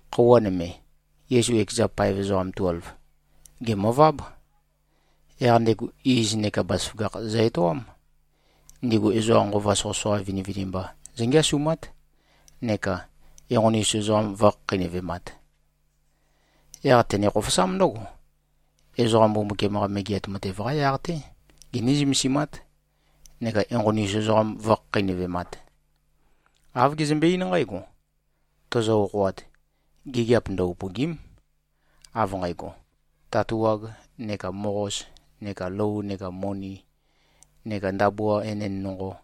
Khøuwa nøme, Yesu ekeza paev ezoqam tuelv, gèmøváb. Yaq ndego iz neka bazaføgakh zø-etoám. Ndigu ezoqa nqova soqøsoqa vinivinimba zǿngeasumát neka enqoni-us ezoqam vǿkhakheinøvemāt. Yaq tene-khofosám ndǿgo, ezoqa Mbumbukiam-qa Megeat Matev-qa yaq-té giní-zømesimát neka enqoni-us ezoqam vǿkhakheinøvemāt. Āv gezømbe-eín nqǽgo, “Tozo-okhoat, gigiap ndø-upø̀gi᷄m, av nqægo, tatuag neka moqos neka lou neka moni neka ndabua enend nonqo.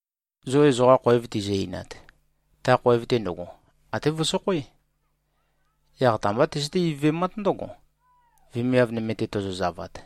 Zo ezoqa khoev tizø-einat, ta khoev-te ndøgo, até vøsokhoé. Yaq ta-mbá tøzøté-ivøvemát ndǿgo, vemiav nøme-te tozozavat.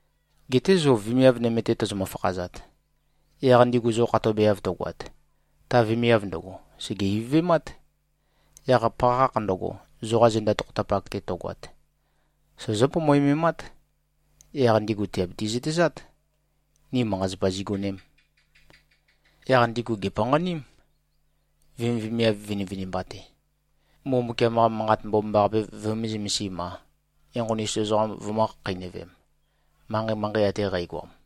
Geté zo vemiav nøme-te tozomø-fakhazat, yaq ndigu zo khatobeav tøgoat, ta vemiav ndøgo, sège-ivøvemát. Yaq pakhakh ndøgo, zoqa zenda tokhotapak-te tøgoat, sozó-pomoememát. Yaq ndigu tìabiti-zøtezát, ni manqa-zapa zigonēm.” Yaq ndigu gèpanqaním, vemivemiav vinivinimba-te, Mbumbukiam-qa Manqat Mbomambaqape vømē-zømesim-a, enqoni-us ezoqam vømø̄-khakheinøvem, manqei-manqei ate qægoam.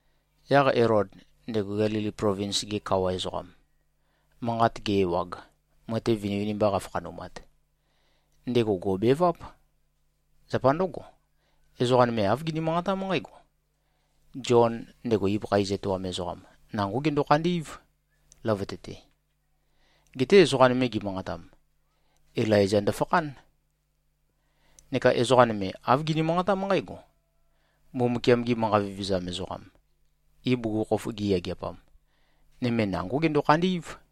Yaq Elod, ndego Gelili plovins-ge kawa ezoqam, manqat ge-ewag, matev vinivinimba qafakhanumat, ndego gò꞉beváp. Zapa ndǿgo, ezoqa nøme āv gini-manqatám nqǽgo, “Zion, ndego ibøkha iz etoam ezoqam, nangó gendo-khandí꞉v, løvøte-te.” Geté ezoqa nøme gimanqatam, “Ilaiza ndøfakhán.” Neka ezoqa nøme, āv gini-manqatám nqǽgo, “Mbumbukiam-gi manqa vevezam ezoqam, ibugukhokhof giyageapam, nøme nangó gendo-khandí꞉v.”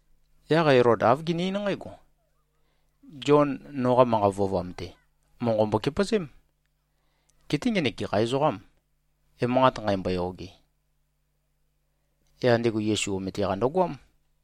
Yaq Elod āv gene-eín nqǽgo, “Zion, noqa manqa vøovam-te, monqo mbokepøzém. Geté ngenek gekha ezoqâm, emanqat nqæmbo-yoge?” Yaq ndego Yesu omete-qa ndøgoám.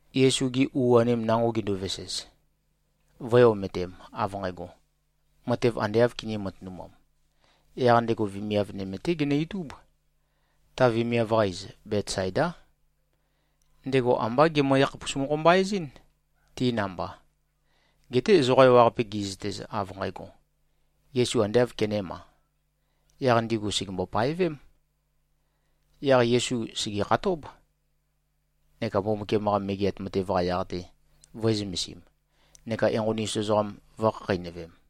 Yesu-gi u-anim nango ginduvesez, vø̄e-ometem, av nqægo, matev ande āv kinī-matønumam, yaq ndego vemiav nøme-té genø-itúb. Ta vemiav-qa iz, Betsaidá. Ndego ambá gemø-yakhapus-mokho-mba-ezín, ti namba. Geté ezoqa ewaqape gi꞉zøtez, av nqægo, Yesu ande āv kenēma, yaq ndigu sègembo-paevém. Yaq Yesu sègekhatób, neka Mbumbukiam-qa Megeat Matev-qa yaq-te vø̄e-zømesim neka enqoni-us ezoqam vø̄khakheinøvem.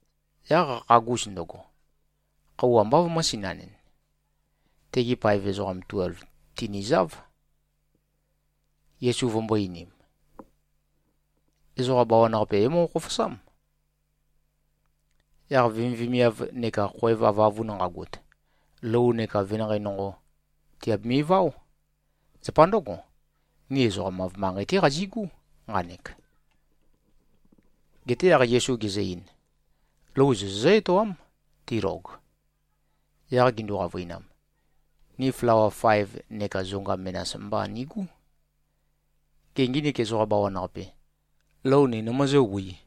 Yaq qakhagus ndøgo, khøuwa ambá vømø̄-sinanɨn. Tegi paev ezoqam tuelv tinìzāv, Yesu vømbō-einim, “Ezoqa bawan-qape é-moqo-khofosám. Yaq vemivemiav neka khoev avøavun nqagot, lou neka venanqei nonqo, tìabimi-váo. Zapa ndǿgo, ni ezoqam-av manqei-té qazigú, nqanek.” Geté yaq Yesu gezø-ein, “Lou zo zozǿ-etoám, tilog.” Yaq gindu-qavøinam, “Ni flawa faev neka zonga menas mba nigú. Gê, nginik ezoqa bawan-qape, lou ni nimøzǿwī?”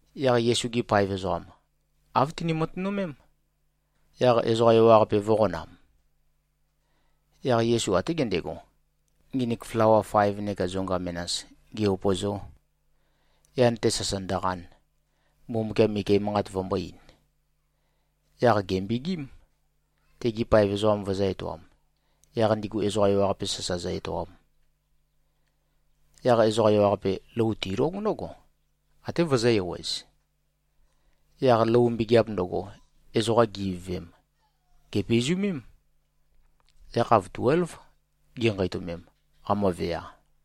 Yaq Yesu-gi paev ezoqam, āv tini-matønømém, yaq ezoqa ewaqape vø̄qonam. Yaq Yesu até gendego, nginik flawa faev neka zonga menas ge-upø̀zō, yan-te sasa ndøqan, Mbumbukiam ike manqat vømbō-ein. Yaq gèmbegím, tegi paev ezoqam vøzø̄-etoam, yaq ndigu ezoqa ewaqape sasa zø-etoam. Yaq ezoqa ewaqape, lou tilóg ndǿgo, até vøzø̄-ewez. Yaq lou mbegeap ndøgo, ezoqa gi-ivøvem, gèpizumém. Yakhav tuélv ginqeitømem, qamøvea.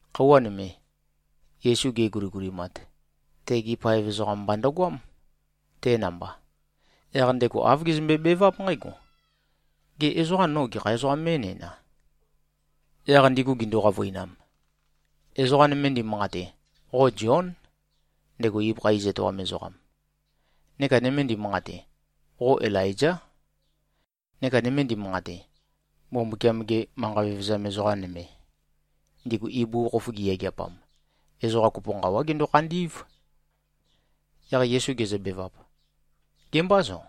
Khøuwa nøme, Yesu geguligulimat, tegi paev ezoqam mba ndøgoám, te namba. Yaq ndego āv gezømbe-beváp nqǽgo, “Gê, ezoqa no gekha ezoqām mé꞉næna?” Yaq ndigu gindu-qavøinam, “Ezoqa nøme ndimanqate, qo Zión, ndego ibøkha iz etoam ezoqam. Neka nøme ndimanqate, qo Ilaizá. Neka nøme ndimanqate, Mbumbukiam-ge manqa vevezam ezoqa nøme, ndigu ibugukhokhof giyageapam, ezoqa kopo nqawá gendo-khandí꞉v.” Yaq Yesu gezøbevap, “Gemâ zo?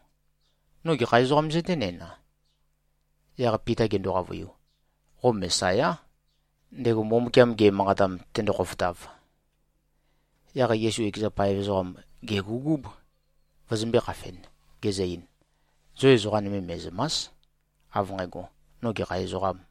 No gekha ezoqām zøténæna?” Yaq Pita gendo-qavøiu, “Qo Mesayá, ndego Mbumbukiam ge꞉manqatam, tendo-khofotav.” Yaq Yesu ekeza paev ezoqam gègugúb, vøzømbē-khafen, gezø-ein, “Zo ezoqa nøme me꞉zø̀ma᷄s, av nqægo, no gekha ezoqām.”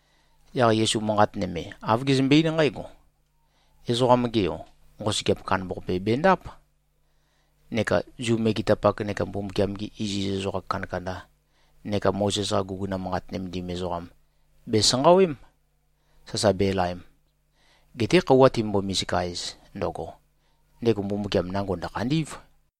Yaq Yesu manqat nøme, āv gezømbe-eín nqǽgo, “Ezoqam-ge Yo, nqosøgeap kandambaqape bendáp. Neka Zu megetapak neka Mbumbukiam-gi iziz ezoqa kandakanda neka Mozes-qa guguna manqat nømendim ezoqam bèsanqawém, sasa belaem. Geté khøuwa timømbo-misika-ez ndøgo, ndego Mbumbukiam nango ndø̀khandí꞉v.”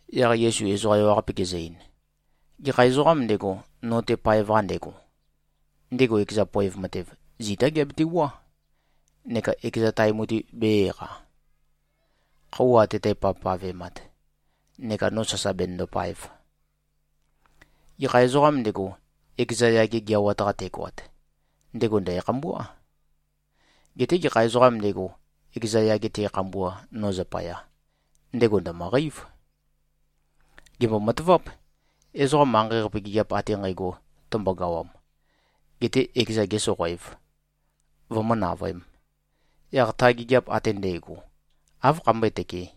Yaq Yesu ezoqa ewaqape gezø-ein, “Gekha ezoqām ndego, no-te paev-qa ndego, ndego ekeza poev matev, zitá geabetewuá, neka ekeza tae mutui bē-eqa, khøuwa ate tæpavpavemat, neka no sasa benøndopaev. Gekha ezoqām ndego, ekeza yage geawat-qa tegoat, ndego ndæ̀khambuá. Geté gekha ezoqām ndego, ekeza yage te꞉khambua, no zapaya, ndego ndø̀møqeív. Gèmbo-mataváp. Ezoqa manqei-qape gigiap ate nqægo tømbogawam, getē ekezan gēsoqoēv, vømǿ-navøēm, yaq ta gigiap ate ndægo, áv khambøé-tøkē?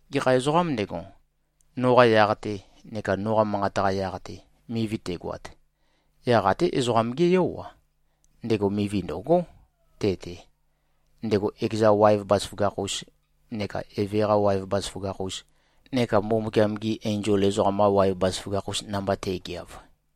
Gekha ezoqām ndego, noqa yaq-te neka noqa manqat-qa yaq-te, mivi tegoat, yaq até Ezoqam-gé Yó-a, ndego mivi ndø̀gó te-te, ndego ekeza waev bazaføgakh-us neka Eve-qa waev bazaføgakh-us neka Mbumbukiam-gi enzol ezoqam-qa waev bazaføgakh-us namba te꞉geav.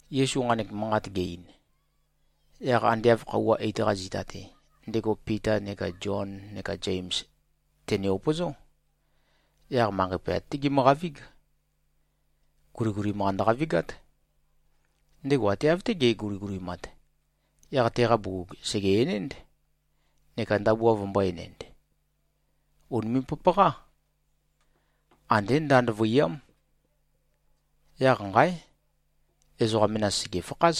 Yesu nqanek manqat ge-ein, yaq ande av khøuwa eit-qa zita-te, ndego Pita neka Zion neka Zems tène-upøzó. Yaq manqei pøyat-té gimøqavíg. Guligulim-qa ndøqavigát. Ndego ate av-té ge꞉guligulimat, yaq teqa bugug sège-enénd, neka ndabua vømbō-enend. Ùnime꞉-papaqá. Andé ndand vøiyám. Yaq nqáe! Ezoqa menas sègefakház.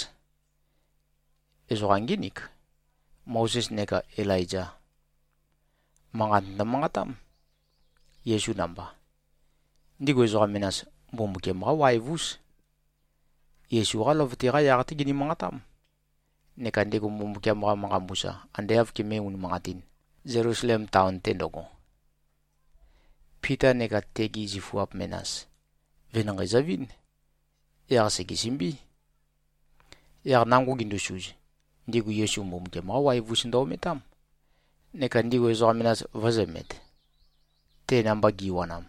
Ezoqa ngínik, Mozes neka Ilaiza. Manqat ndømanqatám, Yesu namba. Ndigu ezoqa menas, Mbumbukiam-qá waev-ús. Yesu-qá løvøte-qa yaq-té gini-manqatám, neka ndego Mbumbukiam-qa manqa mbusa ande āv kemé-unimanqatīn, Zelusalem taon-te ndøgo. Pita neka tegi zifuap menas, venanqei zøvín. Yaq sègesømbí. Yaq nango gindusuz, ndigu Yesu Mbumbukiam-qá waev-ús ndø-ometám, neka ndigu ezoqa menas vø̄zømet, te namba giwanam.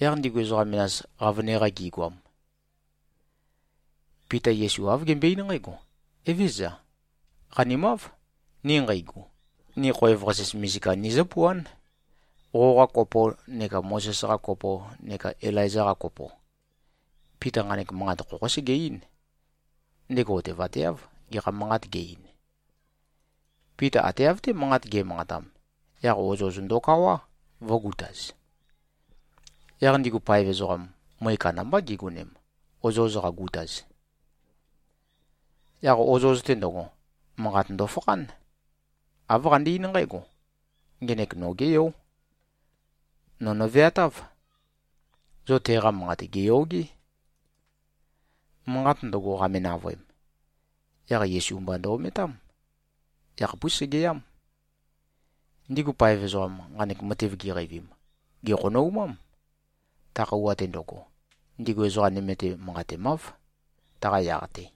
Yaq ndigu ezoqa menas, qavøne-qa gigoam, Pita Yesu āv gembøe-eín nqǽgo, “Evézøza. Qanimáv, ni nqeigu. Ni khoev-qasis misika nizǿpuán, qoqa kopo neka Mozes-qa kopo neka Ilaiza-qa kopo.” Pita nqanek manqat khokhó sege-eín. Ndego otevateáv, gekha manqat ge-ein. Pita ate av-té manqat ge꞉manqatam, yaq ozoz ndokawá, vø̄gutaz. Yaq ndigu paev ezoqam, møe kandambá gigonem, ozoz qagutaz. Yaq ozoz-te ndøgo, manqat ndofakhán. Āv qande-eín nqǽgo, “Ngenek nogé Yó. No nø̀veatáv. Zo teqa manqat gèyogé.” Manqat ndøgo qame-navøem, yaq Yesu mba ndø-ometám. Ekhapús segeyám. Ndigu paev ezoqam, nqanek matev giqeivim, gèkhonoumám. Ta khøuwa-te ndøgo, ndigu ezoqa nøme-te manqatemáv, taqa yaq-te.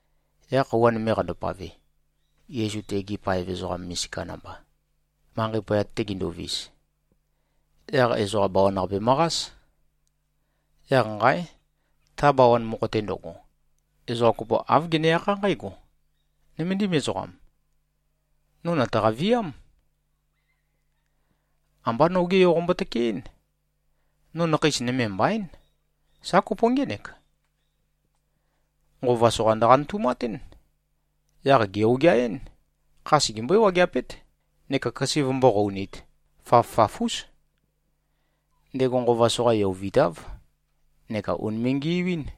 Yaq khøuwa nøme qandopave, Yesu tegi paev ezoqa misika namba, manqei poyat-te ginduvis, yaq ezoqa bawan-qape møqás. Yaq nqáe! Ta bawan mokho-te ndøgo, ezoqa kopo āv gene-akhá nqǽgo, “Nøméndim ezoqam, no nø̀taqa-viám. Ambá noge yo qombo-tøkeɨ́n. No nakheis nøme mbaín. Sa kopo ngének. Nqova soqa ndøqanøtumatún. Yaq gè-ogeaɨ́n. Kha segembøɨ́-wageapét neka køse vømbó-qounīt. Faf-faf-ús. Ndego nqova soqa yovitáv neka ùnime꞉-ngiuín.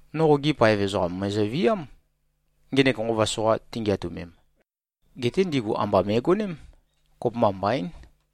No qogi paev ezoqam mø̀ezøviám, ngenek nqova soqa tingeatømem. Geté ndigu amba me꞉goném. Kopømba mbaín.”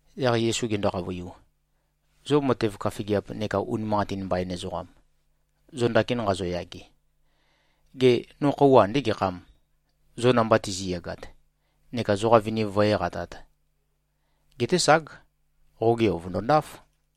Yaq Yesu gendo-qavøiu, “Zo matev køfigiap neka unimanqatin mbain ezoqam, zo ndakin nqazoyage, gê, no khøuwa andé gekhâm, zo namba tizi꞉yagat neka zoqa viniv vǿe-eqatāt? Geté ság! Qoge yo vø̀ndondáf.”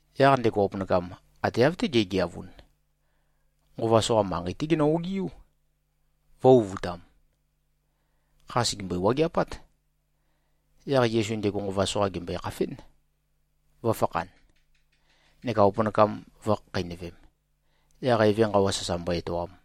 Yaq ndego opønakam, ate av-té ge꞉geavun, nqova soqa manqei-té genø-ogiú, vø̄-uvutam. Kha sègembøi-wageapát. Yaq Yesu ndego nqova soqa gèmbøe-khafén, vø̄fakhan, neka opønakam vø̄khakheinøvem, yaq eve nqawa sasa mbo-etoam.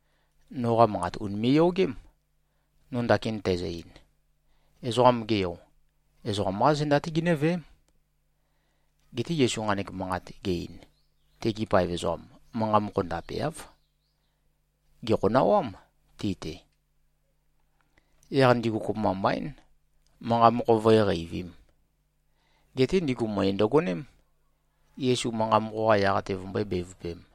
“Noqa manqat ùnime꞉-yogém, no ndakin tæzø-ein. Ezoqam-ge Yo, ezoqam-qá zenda-té ginǿveém.” Geté Yesu nqanek manqat ge-ein, tegi paev ezoqam, manqa mokho ndapeáv. Gèkhonawám ti-te. Yaq ndigu kopømba mbaín, manqa mokho vǿe-qeivīm. Geté ndigu møe ndøgoném, Yesu manqa mokho-qa yaq-te vømbøé-bevøpēm.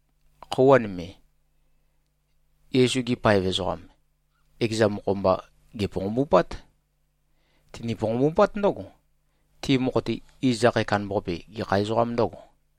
Khøuwa nøme, Yesu-gi paev ezoqam, ekeza mokho-mba, gèponqombupát. Tini-ponqombupát ndǿgo, ti mokho-te, iz akhae kandambaqape, gekha ezoqā ndø̄go.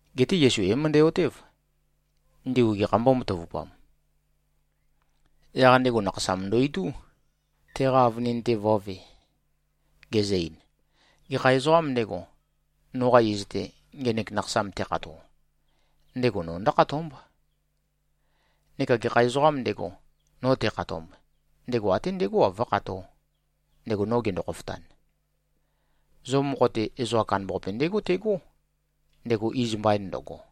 Geté Yesu é-møndæ-otév, ndigu gekhā mbómatavupam. Yaq ndego nakhasam ndo-itú, teqa avønin-te vø̄ve, gezø-ein, “Gekha ezoqām ndego, noqa iz-te, ngenek nakhasam tekhato, ndego no ndǿkhatómb. Neka gekha ezoqām ndego, no tekhatomb, ndego até ndegó-a, vǿkhatō, ndego no gendo-khofotan. Zo mokho-te, ezoqa kandambaqape ndégo tegó, ndego iz mbain ndøgo.”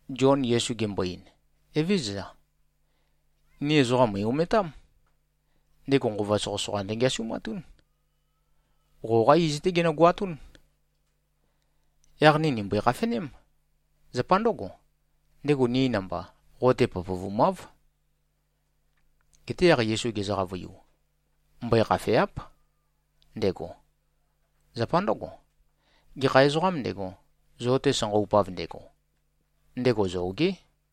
Zion Yesu gembo-ein, “Evézøza. Ni ezoqam mø̀i-ometám. Ndego nqova soqøsoqa ndøngeasumatún. Qoqá iz-té genøgoatún. Yaq ni nìmbøe-khafeném. Zapa ndøgo, ndego ni namba, qo-te pøpøvumáv.” Geté yaq Yesu gezø-qavøiu, “Mbøe-khafèa᷄p, ndego. Zapa ndǿgo, gekha ezoqām ndego, zo-te sanqaupav ndego, ndego zogé.”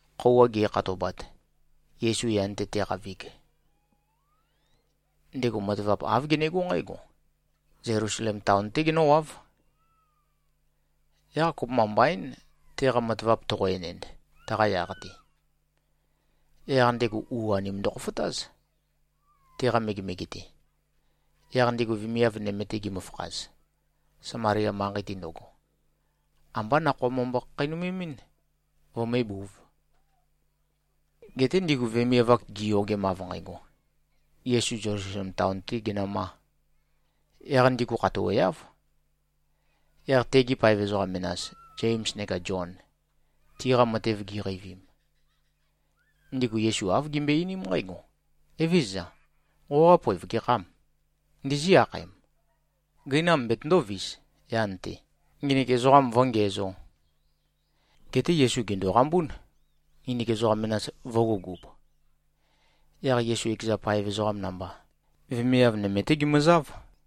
Khøuwa ge꞉khatobat, Yesu yan-te te꞉qavig, ndego matavap āv genegó nqǽgo: Zelusalem taon-té genǿwáv. Yaq kopømba mbaín, teqa matavap toqo-enend taqa yaq-te. Yaq ndego u-anim ndøkhofotáz, teqa megemege-te. Yaq ndigu vemiav nøme-te gimøfakhaz, Samalia manqei-te ndøgo, ambá nakhoa mømbo-khakheinømemɨ́n, vømébūv. Geté ndigu vemiav-ak, giyogem av nqægo, Yesu Zelusalem taon-tē genømā, yaq ndigu khatoweáv. Yaq tegi paev ezoqa menas, Zems neka Zion, tiqa matev giqeivim, ndigu Yesu āv gimbøe-einím nqǽgo, “Evézøza. Qoqa poev gekhâm? Ndizí-akhaem, gøinam betøndōvis yan-te, nginik ezoqam vǿngiæzō?” Geté Yesu gèndoqambún, nginik ezoqa menas vø̄gugub. Yaq Yesu ekeza paev ezoqam namba, vemiav nøme-té gimøzáv.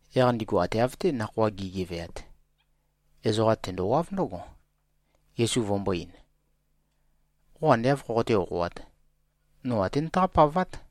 Yaq ndigu ate av-té nakhoa gi꞉geveat, ezoqa tendowáv ndǿgo, Yesu vømbō-ein, “Qo ande āv khoqoté-okhoāt, no até nøtaqá-pavát.”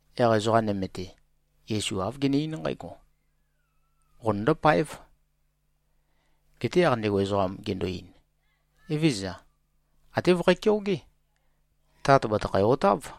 Yaq ezoqa nøme-te, Yesu āv gene-eín nqǽgo, “Qonøndó-páev.” Geté yaq ndego ezoqam gendo-ein, “Evézøza. Até vøkhæ-keogé. Tat bàtøkhæ-otáv.”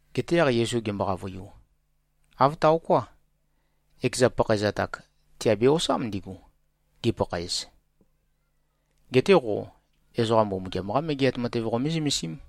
Geté yaq Yesu gembo-qavøiu, “Āv taoká. Ekeza pakhaezat-ak tiabe-osám ndigu, gipakhaez. Geté qo, ezoqa Mbumbukiam-qá Megeat Matev qomé-zømesím.”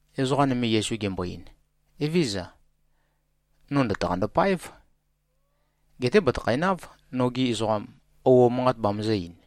Ezoqa nøme Yesu gembo-ein, “Evézøza. No ndø̀taqando-páev. Geté bàtøkhonáv, nogi ezoqam, ouo manqat bamøzø̄-ein.”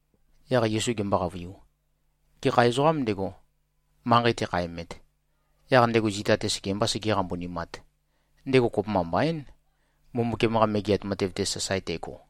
Yaq Yesu gembo-qavøiu, “Gekha ezoqām ndego, manqei tekhaemet, yaq ndego zita-te sekembā segē-qambunimāt, ndego kopømba mbaín, Mbumbukiam-qa Megeat Matev-te sasae tego.”